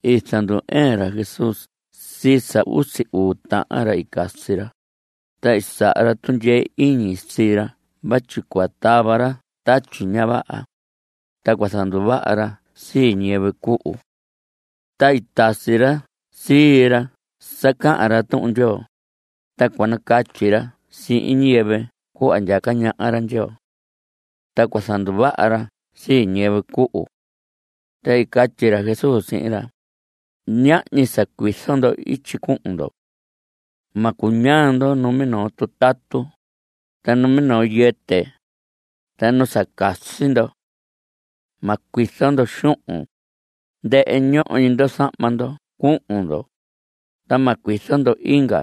I zandu‑ɨɨn ra Jesús sii sa usi uu tahan ra i casi ra, ta i saha ra tundyee iñi sii ra vatyi cua tava ra tatyi ña vaha, ta cua zanduvaha ra sii ñiyɨvɨ cuhu. Ta i tasi ra sii ra sa cahan ra Tuhun Ndyoo, ta cua nacatyi ra sihin ñiyɨvɨ cuhva ndyaca ñaha ra Ndyoo. Ta cua zanduvaha ra sii ñiyɨvɨ cuhu. Ta i catyi ra Jesús sihin ra: Ñahñi sa cuizo ndo ityi cuhun ndo. Ma cuñaa ndo numinoo tutatu, ta numinoo yɨtɨ, ta nu sa casi ndo. Ma cuizo ndo xuhun. Ndɨhɨ ñoho ñi ndo zahma ndo cuhun ndo, ta ma cuizo ndo inga.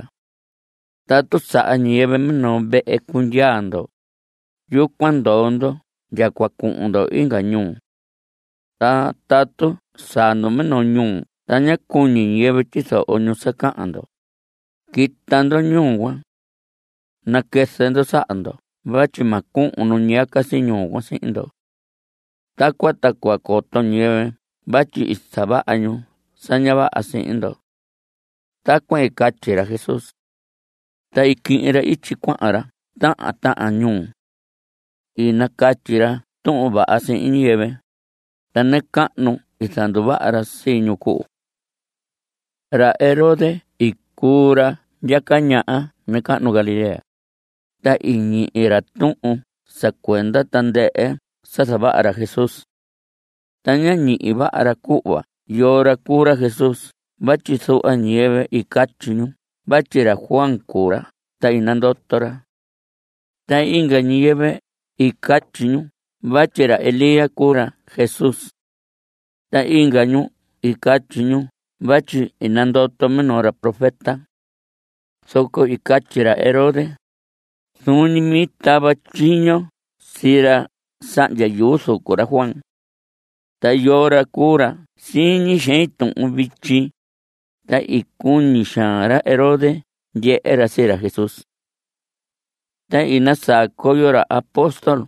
Tatu saha ñiyɨvɨ minoo vehe cundyaa ndo, yucuan ndoo ndo ndya cua cuhun ndo inga ñuu. Ta tatu saa ndo minoo ñuu ta ña cuñi ñiyɨvɨ tyizoho ñu sa cahan ndo, quita ndo ñuu cuan. Naquɨzɨ ndo saha ndo vatyi ma cuhun nu ñiyaca ñuu cuan sihin ndo. Tacuan ta cua coto ñiyɨvɨ vatyi i zavaha ñu sa ña vaha sihin ndo. Tacuan i catyi ra Jesús. Ta i quihin ra ityi cuahan ra tahan tahan ñuu. I nacatyi ra Tuhun Vaha sihin ñiyɨvɨ, ta nacahnu i zanduvaha ra sii ñu cuhu. Ra Herodes i cuu ra ndyaca ñaha nacahnu Galilea. Ta i ñihi ra tuhun sa cuenda tandɨhɨ sa zavaha ra Jesús. Ta ñá ñihi vaha ra cuhva yoo ra cuu ra Jesús vatyi zuhva ñiyɨvɨ i catyi ñu vatyi ra Juan cuu ra ta i nandoto ra. Ta inga ñiyɨvɨ i catyi ñu vatyi ra Elías cuu ra Jesús. Ta inga ñu i catyi ñu vatyi i nandoto minoo ra profeta. Zoco i catyi ra Herodes: Zuun ñi mi i tava tyiño sii ra sahndya yuu zucu ra Juan. ¿Ta yoo ra cuu ra siñi xein tuhun vityi? Ta i cuñi xaan ra Herodes ndyehe ra sii ra Jesús. Ta i nasaa coyo ra apóstol,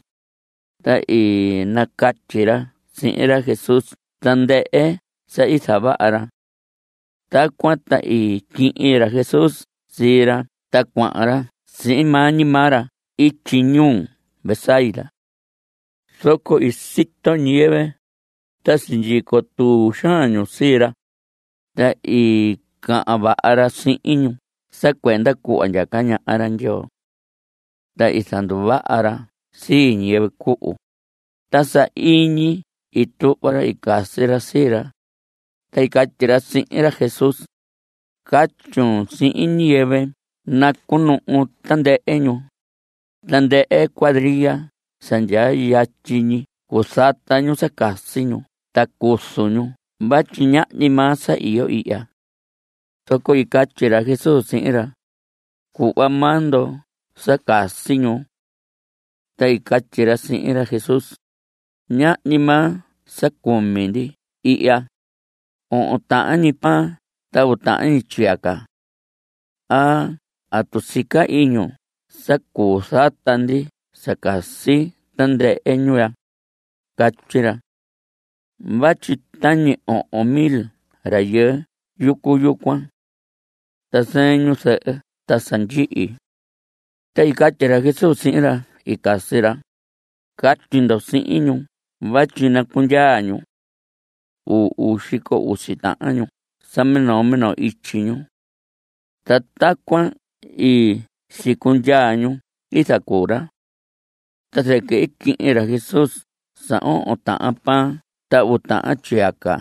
ta i nacatyi ra sihin ra Jesús tandɨhɨ sa i zavaha ra. Tacuan ta i quihin ra Jesús sii ra ta cuahan ra sihin maa ñi maa ra ityi ñuu Betsaida. Zoco i sito ñiyɨvɨ, ta sindyico tuu xaan ñu sii ra, ta i cahan vaha ra sihin ñu sa cuenda cuhva ndyaca ñaha ra Ndyoo. Ta i zanduvaha ra sii ñiyɨvɨ cuhu. Ta sahiñi i tuhva ra i casi ra sii ra, ta i catyi ra sihin ra Jesús: Catyun sihin ñiyɨvɨ nacuhun ñu tandɨhɨ ñuu, tandɨhɨ cuadria sa ndyaa yatyi ñi cuzata ñu sa casi ñu ta cuzu ñu vatyi ñahñi maa sa iyo ihya. Zoco i catyi ra Jesús sihin ra: Cuhva maa ndo sa casi ñu. Ta i catyi ra sihin ra Jesús: Ñahñi maa sa cumi ndi ihya, ohon tahan ñi pan ta uu tahan ñi tyiyaca. ¿A atu sica iñun sa cuu zata ndi sa casi tandɨhɨ ñu ya? Catyi ra. Vatyi tañi ohon mil rayɨɨ yucu yucuan. (Ta zɨɨn ñu zɨhɨ ta sa ndyihi.) Ta i catyi ra Jesús sihin ra i casi ra: Catyi ndo sihin ñu vatyi nacundyaa ñu. Uu xico usi tahan ñu sa minoo minoo ityi ñu. Ta tacuan i sicundyaa ñu i zacuu ra. Ta zɨquɨ i quihin ra Jesús sa ohon tahan pan ta uu tahan tyiyaca,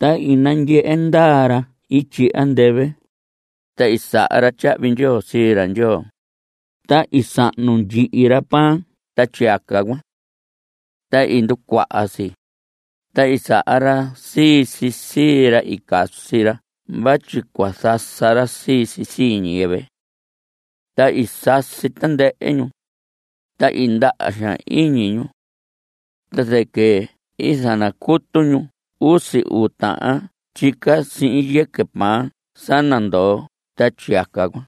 ta i nandyehe ndaa ra ityi andɨvɨ, ta i saha ra tyahvi ndyoo sii ra Ndyoo. Ta i sahnu ndyihi ra pan ta tyiyaca cuan. Ta i nducuaha si. Ta i saha ra sii si sii ra i casi ra vatyi cua zasa ra sii si sii ñiyɨvɨ. Ta i sasi tandɨhɨ ñu, ta i ndaha xaan iñi ñu. Ta zɨquɨ i zanacutu ñu usi uu tahan tyica sihin yɨquɨ pan sa nandoo ta tyiyaca cuan.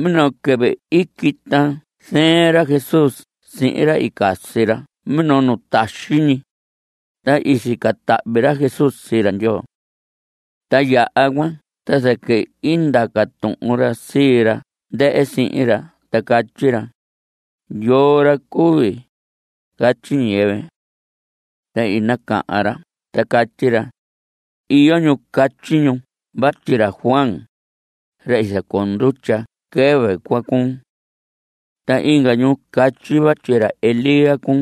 Minoo quɨvɨ i quita zɨɨn ra Jesús sihin ra i casi ra minoo nu taxi ñi, ta i sica tahvi ra Jesús sii ra Ndyoo. Ta yaha cuan ta zɨquɨ i ndaca tuhun ra sii ra ndɨhɨ sihin ra ta catyi ra: ¿Yoo ra cui, catyi ñiyɨvɨ? Ta i nacahan ra ta catyi ra: Iyo ñu catyi ñu vatyi ra Juan, ra i zacoo ndutya quɨvɨ cuan cuun. Ta inga ñu catyi vatyi ra Elías cuun.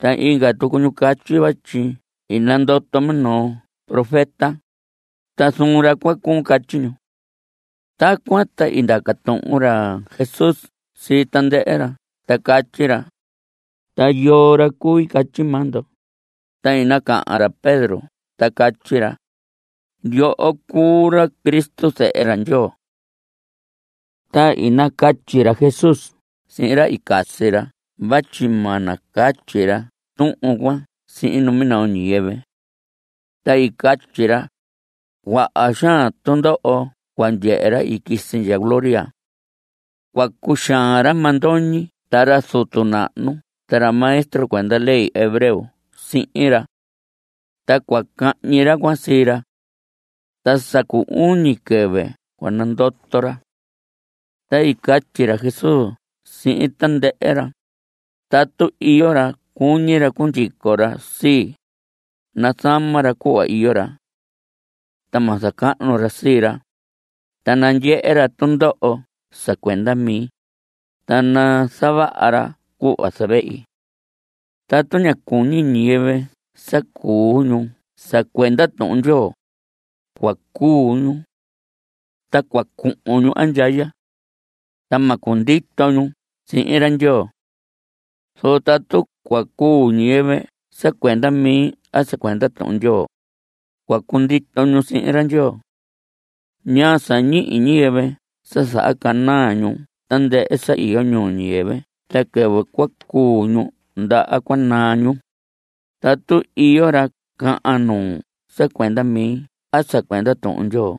Ta inga tucu ñu catyi vatyi i nandoto minoo profeta, ta zuun ra cuan cuun. Catyi ñu. Tacuan ta i ndaca tuhun ra Jesús sii tandɨhɨ ra ta catyi ra: ¿Ta yoo ra cui catyi maa ndo? Ta i nacahan ra Pedro ta catyi ra: Yoho cuu ra Cristo. Zehe ra Ndyoo. Ta i nacatyi ra Jesús sihin ra i casi ra vatyi ma nacatyi ra tuhun cuan sihin numinoo ñiyɨvɨ. Ta i catyi ra: Cuaha xaan tundoho cua ndyehe ra i quisi ndya gloria. Cua cuxaan ra mandoñi ta ra zutu nahnu ta ra maestro cuenda ley hebreo sihin ra. Ta cua cahñi ra cuan sii ra. Ta sa cu uñi quɨvɨ cua nandoto ra. Ta i catyi ra Jesús sihin tandɨhɨ ra: Tatu iyo ra cuñi ra cundyico ra sii, nazama ra cuhva iyo ra. Ta ma zacahnu ra sii ra. Ta nandyehe ra tundoho sa cuenda mi. Ta nazavaha ra cuhva zavehi. Tatu ña cuñi ñiyɨvɨ sa cuu ñu sa cuenda Tuhun Ndyoo, cua cuu ñu. Ta cua cuhun ñu andyaya. Ta ma cundito ñu sihin ra Ndyoo. Zoco tatu cua cuu ñiyɨvɨ sa cuenda mi a sa cuenda Tuhun Ndyoo, cua cundito ñu sihin ra Ndyoo. ¿Ñaa sa ñihi ñiyɨvɨ sa zahacanaa ñu tandɨhɨ sa iyo ñuu ñiyɨvɨ ta quɨvɨ cua cuu ñu ndaha cua naa ñu? Tatu iyo ra cahan nuu sa cuenda mi a sa cuenda Tuhun Ndyoo,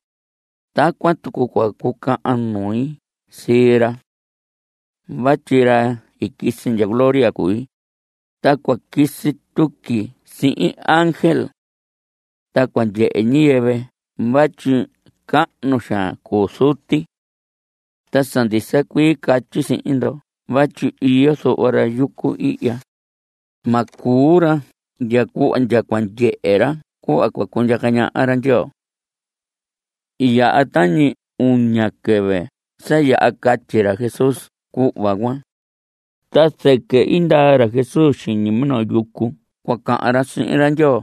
tacuan tucu cua cucahan nui sihin ra. Vatyi ra i quisi ndya gloria cui, ta cua quisi tuqui sihin ángel. Ta cua ndyehe ñiyɨvɨ vatyi cahnu xaan cuu Zuti. Ta sa ndisa cuii catyi sihin ndo vatyi iyo zuhva ra yucu ihya, ma cuu ra ndya cuhva ndya cua ndyehe ra cuhva cua cundyaca ñaha ra Ndyoo. I yaha tañi uña quɨvɨ sa yaha catyi ra Jesús cuhva cuan. Ta zɨquɨ i ndaa ra Jesús xiñi minoo yucu cua cahan ra sihin ra Ndyoo,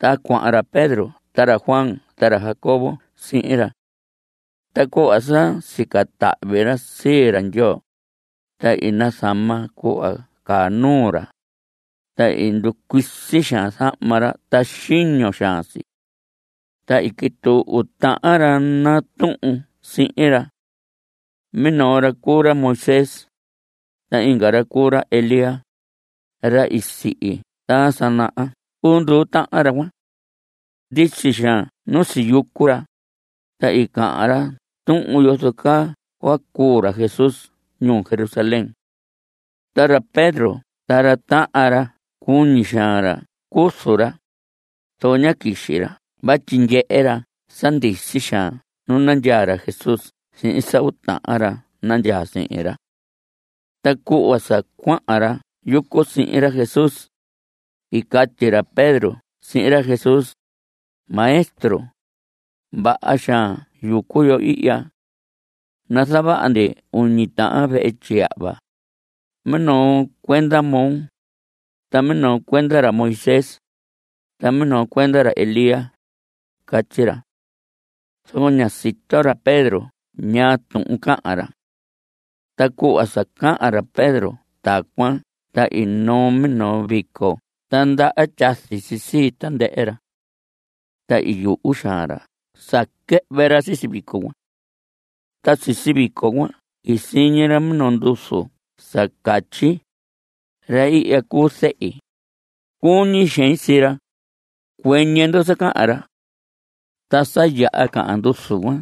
ta cuahan ra Pedro ta ra Juan ta ra Jacobo sihin ra. Ta cuhva sa sica tahvi ra sii ra Ndyoo, ta i zama cuhva caa nuu ra, ta i nducuisi xaan zahma ra ta xiño xaan si. Ta i quituu uu tahan ra natuhun sihin ra. Minoo ra cuu ra ra Moisés, ta inga ra cuu ra ra Elías. (Ra i sihi ta sa naha cuu nduu tahan ra cuan.) Ndisi xaan nu siyucu ra, ta i cahan ra tuhun yozo caa cua cuu ra Jesús ñuu Jerusalén. Ta ra Pedro ta ra tahan ra cuñi xaan ra cuzu ra, zoco ñá quixi ra vatyi ndyehe ra sa ndisi xaan nu nandyaa ra Jesús sihin sa uu tahan ra nandyaa sihin ra. Ta cuhva sa cuahan ra yucu sihin ra Jesús, i catyi ra Pedro sihin ra Jesús: Maestro, vaha xaan yucu yo ihya. Nazavaha ndi uñi tahan vehe tyiyahva, minoo cuenda moo, ta minoo cuenda ra Moisés, ta minoo cuenda ra Elías, catyi ra. Zoco ñá sito ra Pedro ñaa tuhun cahan ra. Ta cuhva sa cahan ra Pedro tacuan ta i noo minoo vico ta ndaha tyazi si sii tandɨhɨ ra. Ta i yuhu xaan ra sa quɨhvɨ ra sisi vico cuan. Ta sisi vico cuan i siñi ra minoo nduzu sa catyi: Ra ihya cuu Zehi. Cuñi xein sii ra. Cuɨñɨ ndo sa cahan ra. Ta sa yaha cahan nduzu cuan,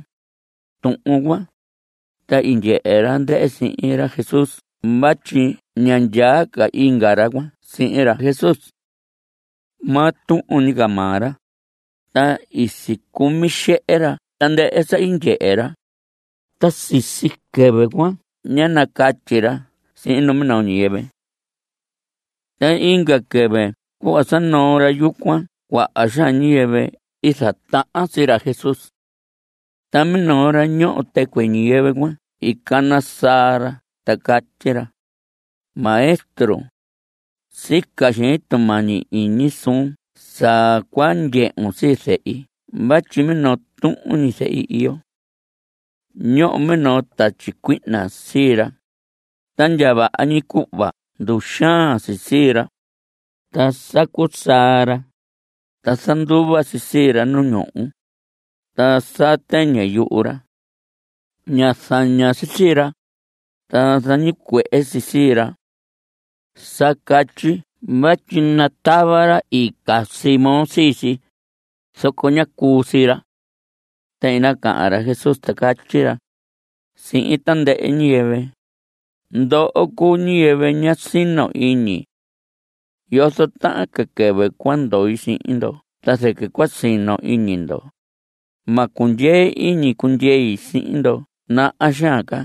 tuhun cuan, ta i ndyehe ra ndɨhɨ sihin ra Jesús vatyi ña ndyaa ca inga ra cuan sihin ra Jesús. Maa tuhun ñi ca maa ra. Ta i sicumi xehe ra tandɨhɨ sa i ndyehe ra, ta sisi quɨvɨ cuan ñá nacatyi ra sihin numinoo ñiyɨvɨ. Ta inga quɨvɨ cuhva sa noo ra yucu cuan, cuaha xaan ñiyɨvɨ i zatahan sii ra Jesús. Ta minoo ra ñoho tɨcuɨ ñiyɨvɨ cuan i cana saa ra ta catyi ra: Maestro, sica xein tumañi iñi suun sa cua ndyehun sii zehi vatyi minoo tuhun ñi zehi iyo. Ñoho minoo tatyi cuihna sii ra, ta ndya vaha ñi cuhva nduxaan si sii ra. Ta sacu saa ra, ta zanduva si sii ra nu ñuhu, ta saa tɨñɨ yuhu ra. Ña zaña si sii ra, ta zañicuehe si sii ra. Sa catyi vatyi natava ra i casi moo sii si, zoco ñá cuu sii ra. Ta i nacahan ra Jesús, ta catyi ra (sihin tandɨhɨ ñiyɨvɨ): Ndoho cuu ñiyɨvɨ ña sino iñi. ¿Yozo tahan ca quɨvɨ cua ndoi sihin ndo ta zɨquɨ cua sino iñi ndo? Ma cundyee iñi cundyei sihin ndo naha xaan ca.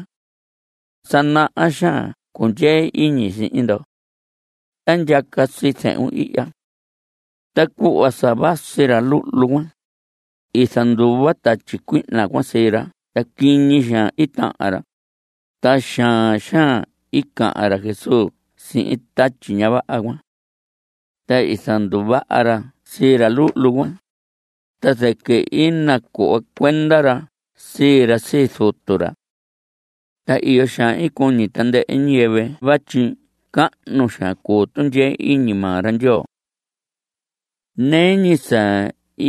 Sa naha xaan cundyee iñi sihin ndo. Ta ndyaca sii zehun ihya. Ta cuhva sa vasi ra luhlu cuan, i zanduva tatyi cuihna cuan sii ra ta quiñi xaan i tahan ra. Ta xaan xaan i cahan ra Jesús sihin tatyi ña vaha cuan. Ta i zanduvaha ra sii ra luhlu cuan, ta zɨquɨ i nacuhva cuenda ra sii ra sii zutu ra. Ta iyo xaan i cuñi tandɨhɨ ñiyɨvɨ vatyi cahnu xaan cuu tundyee iñi maa ra Ndyoo. Nɨɨ ñi sa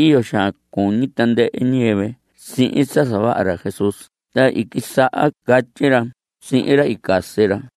iyo xaan cuñi tandɨhɨ ñiyɨvɨ sihin sa zavaha ra Jesús ta i quisaha catyi ra sihin ra i casi ra: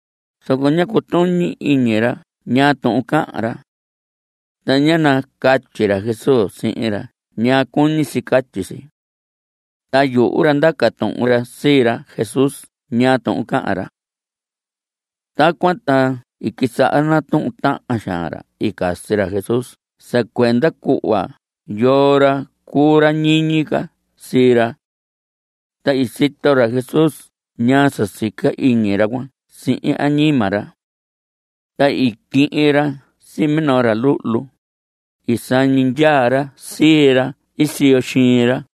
Zoco, ñá cutuñi iñi ra ñaa tuhun cahan ra. Ta ñá nacatyi ra Jesús sihin ra ñaa cuñi si catyi si. Ta yuhu ra ndaca tuhun ra sii ra Jesús ñaa tuhun cahan ra. Tacuan ta i quisaha natuhun tahan xaan ra i casi ra Jesús sa cuenda cuhva yoo ra cuu ra ñiñi ca sii ra. Ta i sito ra Jesús ñaa sa sica iñi ra cuan sihin añima ra. Ta i quihin ra sii minoo ra luhlu, i sañi ndyaa ra sii ra ii siyo xiin ra.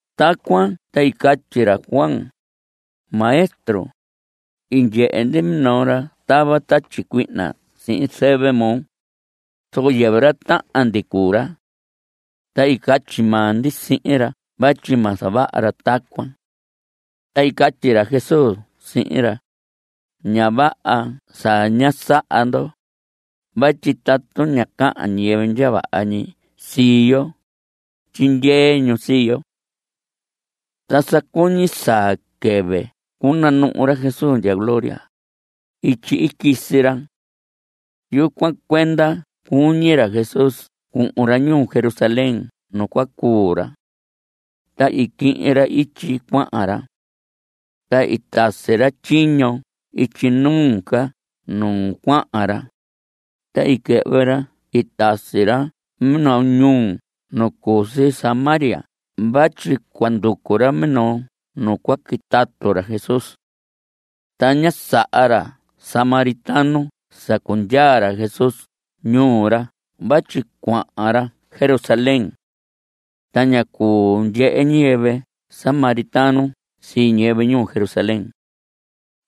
Tacuan ta i catyi ra Juan: Maestro, i ndyehe ndi minoo ra tava tatyi cuihna sihin zɨvɨ moo, zoco yɨvɨ ra tahan ndi cuu ra. Ta i catyi maa ndi sihin ra vatyi ma zavaha ra tacuan. Ta i catyi ra Jesús sihin ra: Ña vaha sa ñá saha ndo. Vatyi tatu ña cahan ñiyɨvɨ ndya vaha ñi sii yo, tyindyee ñu sii yo. Ta sa cuñi saa quɨvɨ cunanuhu ra Jesús ndya gloría, ityi i quisi ra. Yucuan cuenda cuñi ra Jesús cuhun ra ñuu Jerusalén nu cua cuu ra. Ta i quihin ra ityi cuahan ra. Ta i tasi ra tyiño ityi nuu ca nu cuahan ra, ta i quɨhvɨ ra i tasi ra minoo ñuu nu cu si Samaria vatyi cua nducu ra minoo nu cua quitatu ra Jesús. Ta ñá saha ra samaritano sa cundyaa ra Jesús ñuu ra vatyi cuahan ra Jerusalén. (Ta ña cuu ndyehe ñiyɨvɨ samaritano sii ñiyɨvɨ ñuu Jerusalén.)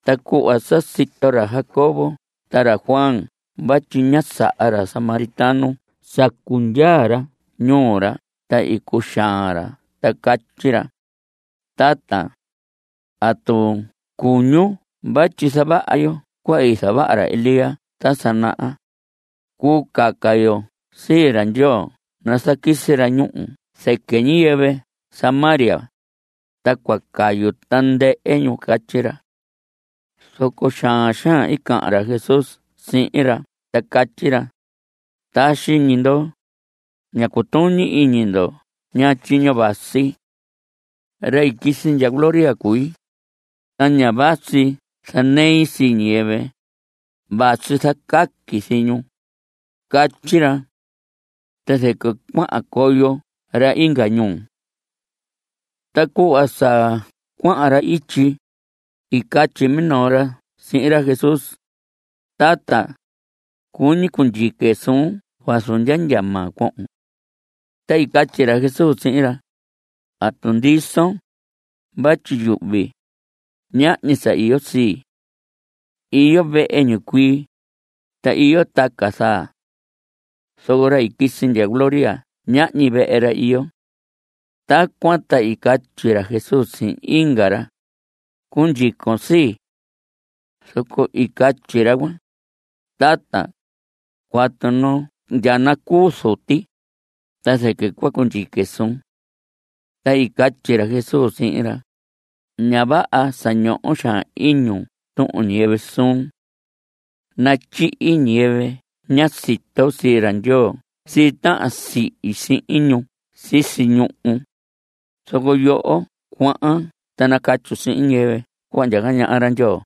Ta cuhva sa sito ra Jacobo ta ra Juan vatyi ñá saha ra samaritano sa cundyaa ra ñuu ra ta i cuxaan ra ta catyi ra: Tata, ¿atu cuñun vatyi zavaha yo cuhva i zavaha ra Elías ta sa naha? Cuu caca yo sii ra Ndyoo nazaquisi ra ñúhu zɨquɨ ñiyɨvɨ Samaria, ta cua cayu tandɨhɨ ñu. Catyi ra. Zoco xaan xaan i cahan ra Jesús sihin ra ta catyi ra: Taxi ñi ndo. Ña cutuñi iñi ndo ñaa tyiño vasi. Ra i quisi ndya gloria cui, ta ña vasi zanei sii ñiyɨvɨ, vasi zacaqui sii ñu. Catyi ra. Ta zɨquɨ cuahan coyo ra inga ñuu. Ta cuhva sa cuahan ra ityi, i catyi minoo ra sihin ra Jesús: Tata, cuñi cundyique suun vazu ndya ndya maa cuohon. Ta i catyi ra Jesús sihin ra: ¿Atu ndison? vatyi yuhvi, ñahñi sa iyo sii. Iyo vehe ñicuii, ta iyo taca zaa. Zoco ra i quisi ndya gloria ñahñi vehe ra iyo. Tacuan ta i catyi ra Jesús sihin inga ra: Cundyicon sii. Zoco i catyi ra cuan: Tata, cuatu ndya nacuu zuti, ta zɨquɨ cua cundyique suun. Ta i catyi ra Jesús sihin ra: Ña vaha sa ñoho xaan iñun tuhun ñiyɨvɨ suun. Natyihi ñiyɨvɨ ña sito sii ra Ndyoo sii tahan sihi sihin ñu sisi ñuhu, zoco yoho cuahan ta nacatyun sihin ñiyɨvɨ cuhva ndyaca ñaha ra Ndyoo.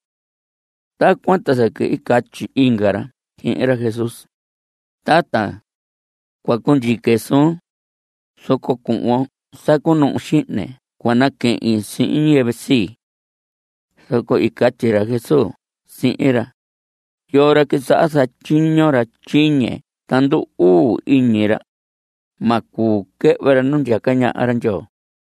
Tacuan ta zɨquɨ i catyi inga ra sihin ra Jesús: Tata, cua cundyique suun, zoco cuhvon sa cunuhu xihne cua naquehin sihin ñiyɨvɨ sii. Zoco i catyi ra Jesús sihin ra: Yoo ra quisaha zatyiño ra tyiñe ta ndu‑uu iñi ra, ma cuu quɨhvɨ ra nu ndyaca ñaha ra Ndyoo.